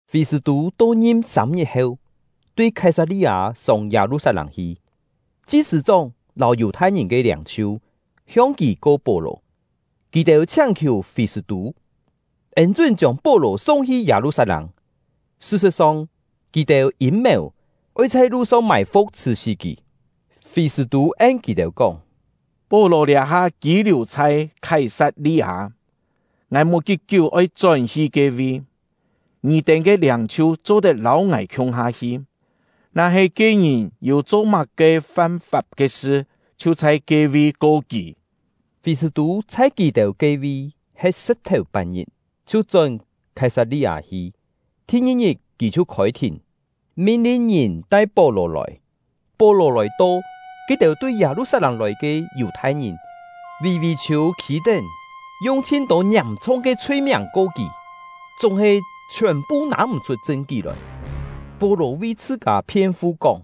Fî-sṳ̂-tû to-ngim sâm-ngit heu, tui Khái-sat-li-â sông Yâ-lu-sat-lâng hi. Chi-sṳ̂-chóng lâu Yù-thai-ngìn ke liâng-chhiu hiong kì ko Pó-lò. Kì-têu chhiáng-khiù Fî-sṳ̂-tû, ên-chún chiông Pó-lò sung-hi Yâ-lu-sat-lâng; sṳ-sṳ̍t-song, kì-têu yîm-mèu oi chhai lu-song mài-fu̍k chhṳ̀-sí kì. Fî-sṳ̂-tû en kì-têu kóng: “Pó-lò liá-ha kî-liù chhai Khái-sat-li-â, ngài mò kí-kiú oi chón-hi ke-vi. Ngì-têu ke liâng-chhiu cho-tet lâu ngài khiung-ha hi, na-he ke ngìn yû cho má-ke fam-fap ke sṳ, chhiu chhai ke-vi ko kì.” Fî-sṳ̂-tû chhai kì-têu ke-vi he̍t sṳ̍p-thèu-pat-ngit chhiu chón Khái-sat-li-â hi. Thi-ngi-ngit kì chhiu khôi-thìn, min-lin ngìn tai Pó-lò lòi. Pó-lò lòi-to, ke-têu tui Yâ-lu-sat-lâng lòi ke Yù-thai-ngìn vì-vì-chhiû khî-tén, yung chhin-tô ngiàm-chhung ke chhui-miàng ko kì, chúng-he chhiòn-phu nâ-m̀-chhut chṳn-kí lòi. Pó-lò vi chhṳ-kâ phien-fu kóng: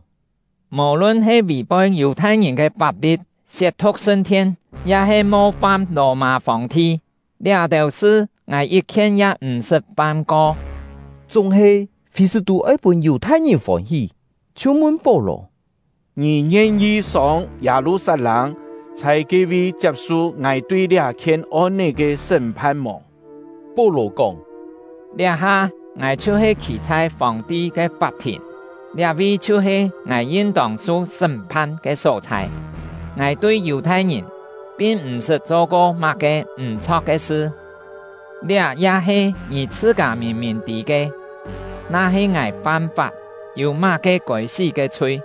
“Mò-lun he vì-poi Yù-thai-ngìn ke fap-li̍t, siet-thu̍k sṳn-thien, ya-he mo-fam Lò-mâ Fòng-ti, liá-têu sṳ ngài yit-khien ya m̀-sṳt fam-ko.” Chúng-he Fî-sṳ̂-tû oi pûn Yù-thai-ngìn fôn-hí, chhiu mun Pó-lò: “Ngì ngien-yi sông Yâ-lu-sat-lâng, chhai ke-vi chiap-su ngài tui liá-khien on-é ke sṳ́m-phan mò?” Pó-lò kóng: “Liá-ha ngài chhiu-he khî chhai Fòng-ti ke fap-thìn, liá-vi chhiu-he ngài yin-tông su sṳ́m-phan ke só-chhai. Ngài tui Yù-thai-ngìn pin m̀-sṳt cho-ko má-ke m̀-chho̍k ke sṳ, liá ya he ngì chhṳ-kâ mìn-mìn tî ke. Na-he ngài fam-fap, yû má-ke kôi-sí ke chhui,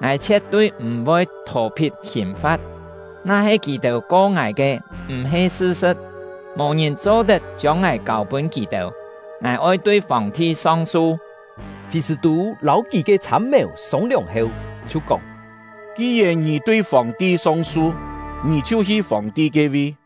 ngài chhie̍t-tui m̀-voi thò-phit hìn-fa̍t. Na-he kì-têu ko ngài ke m̀-he sṳ-sṳ̍t, mò ngìn cho-tet chiông ngài kâu-pûn kì-têu. Ngài oi tui Fòng-ti song-su!” Fî-sṳ̂-tû lâu kì ke chhâm-mèu sông-liòng heu, chhiu kóng: “Ki-yèn ngì tui Fòng-ti song-su, ngì chhiu hi Fòng-ti ke-vi!”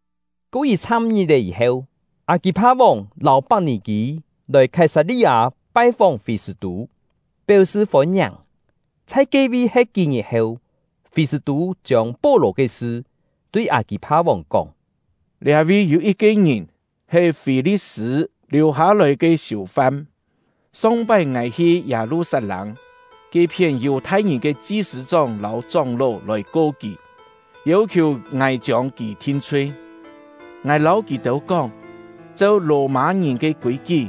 Ko yit-chham ngit-è yî-heu, Â-kî-pha-vòng lâu Pak-nì-kî lòi Khái-sat-li-â pai-fóng Fî-sṳ̂-tû, péu-sṳ fôn-ngiàng. Chhai ke-vi he̍t kí-ngit heu, Fî-sṳ̂-tû chiông Pó-lò ke sṳ tui Â-kî-pha-vòng kóng: “Liá-vi yû yit-ke ngìn, he Fî-li̍t-sṳ̂ liù-hâ-lòi ke siù-fam. Song-pái ngài hi Yâ-lu-sat-lâng, ke-phién Yù-thai-ngìn ke chi-sṳ̂-chóng lâu chóng-ló lòi ko kì, yêu-khiù ngài chiông kì thin-chhui. Ngài lâu kì-têu kóng, cheu Lò-mâ-ngìn ke kûi-kí,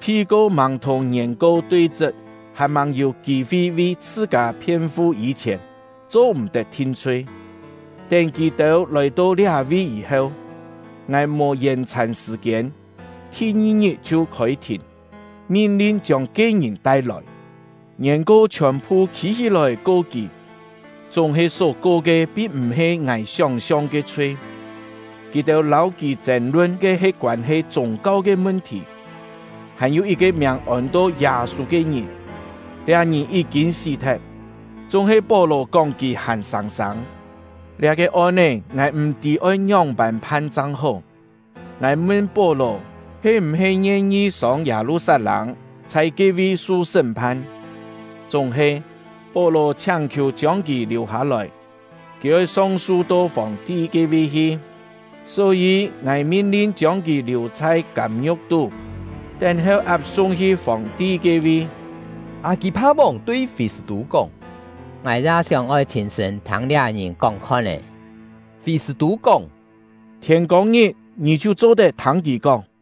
phi-ko màng thùng ngièn-ko tui-chṳt, hàn-màng yû kî-fi vi chhṳ-kâ phien-fu yî-chhièn, cho-m̀-tet thin-chhui. Tén kì-têu lòi-to liá-vi yî-heu, ngài mò yèn-chhàn sṳ̀-kiên, thi-ngi-ngit chhiu khôi-thìn, min-lin chiông ke ngìn tai-lòi. Ngièn-ko chhiòn-phu khî-hí-lòi ko kì, chúng-he só ko ke pin m̀-he ngài sióng-siong ke chhui. Kì-têu lâu kì chên-lun ke he koân-he chûng-kau ke mun-thì, hàn-yû yit-ke miàng ôn-to Yâ-sû ke ngìn; liá ngìn yí-kîn sí-thet, chúng-he Pó-lò kóng kì hàn sâng-sâng. Liá-ke on-é ngài m̀-tî oi ngióng-pân phan chang hó. Ngài mun Pó-lò he m̀-he ngien-yi sông Yâ-lu-sat-lâng, chhai ke-vi su sṳ́m-phan. Chúng-he, Pó-lò chhiáng-khiù chiông kì liù-hâ-lòi, kì oi song-su to Fòng-ti ke-vi hi. Só-yî ngài min-lin chiông kì liù chhai kâm-ngiu̍k tú, tén-heu ap-sung hi Fòng-ti ke-vi.” Â-kî-pha-vòng tui Fî-sṳ̂-tû kóng: “Ngài ya sióng-oi chhîn-sṳ̂n thâng liá ngìn kóng-khon-é.” Fî-sṳ̂-tû kóng: “Thiên-kông-ngit ngì chhiu cho-tet thâng kì kóng.”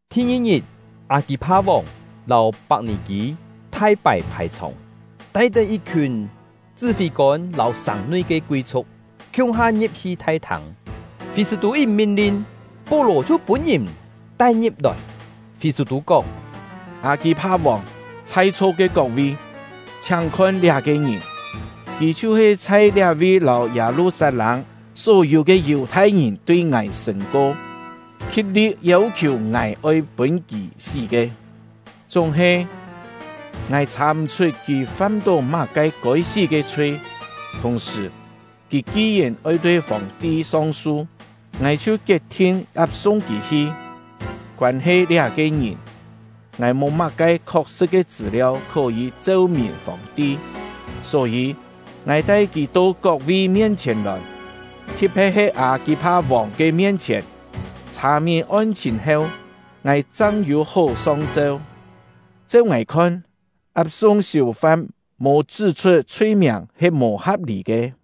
Thi-ngi-ngit, Â-kî-pha-vòng lâu Pak-nì-kî thai pái phài-chhòng, tai-tén yit-khiùn chṳ́-fî-kôn lâu sàng-nui ke kui-chhu̍k, khiung-ha ngi̍p-hi thai-thâng. Fî-sṳ̂-tû yit min-lin, Pó-lò chhiu pûn-ngìn tai-ngi̍p-lòi. Fî-sṳ̂-tû kóng: “Â-kî-pha-vòng, chhai-chho ke kok-vi! Chhiáng khon liá-ke ngìn; kì chhiu-he chhai liá-vi lâu Yâ-lu-sat-lâng só-yû ke Yù-thai-ngìn tui ngài sṳ̂n-ko, khi̍t-li̍t yêu-khiù ngài oi pûn kì sí ke. Chúng-he, ngài chhà-m̀-chhut kì fam-tó má-ke kôi-sí ke chhui; thùng-sṳ̀, kì ki-yèn oi tui Fòng-ti song-su, ngài chhiu kiet-thin ap-sung kì hi. Koân-he liá-ke ngìn, ngài mò má-ke khok-sṳ̍t ke chṳ̂-liau khó-yî cheu-mìn Fòng-ti; só-yî, ngài tai kì to kok-vi mien-chhièn lòi, thi̍t-phe̍t he Â-kî-pha-vòng ke mien-chhièn, chhà-mìn on-chhìn heu, ngài chang yû hó song-cheu. Cheu ngài khon, ap-sung siù-fam mò chṳ́-chhut chhui-miàng he mò ha̍p-lî ke.”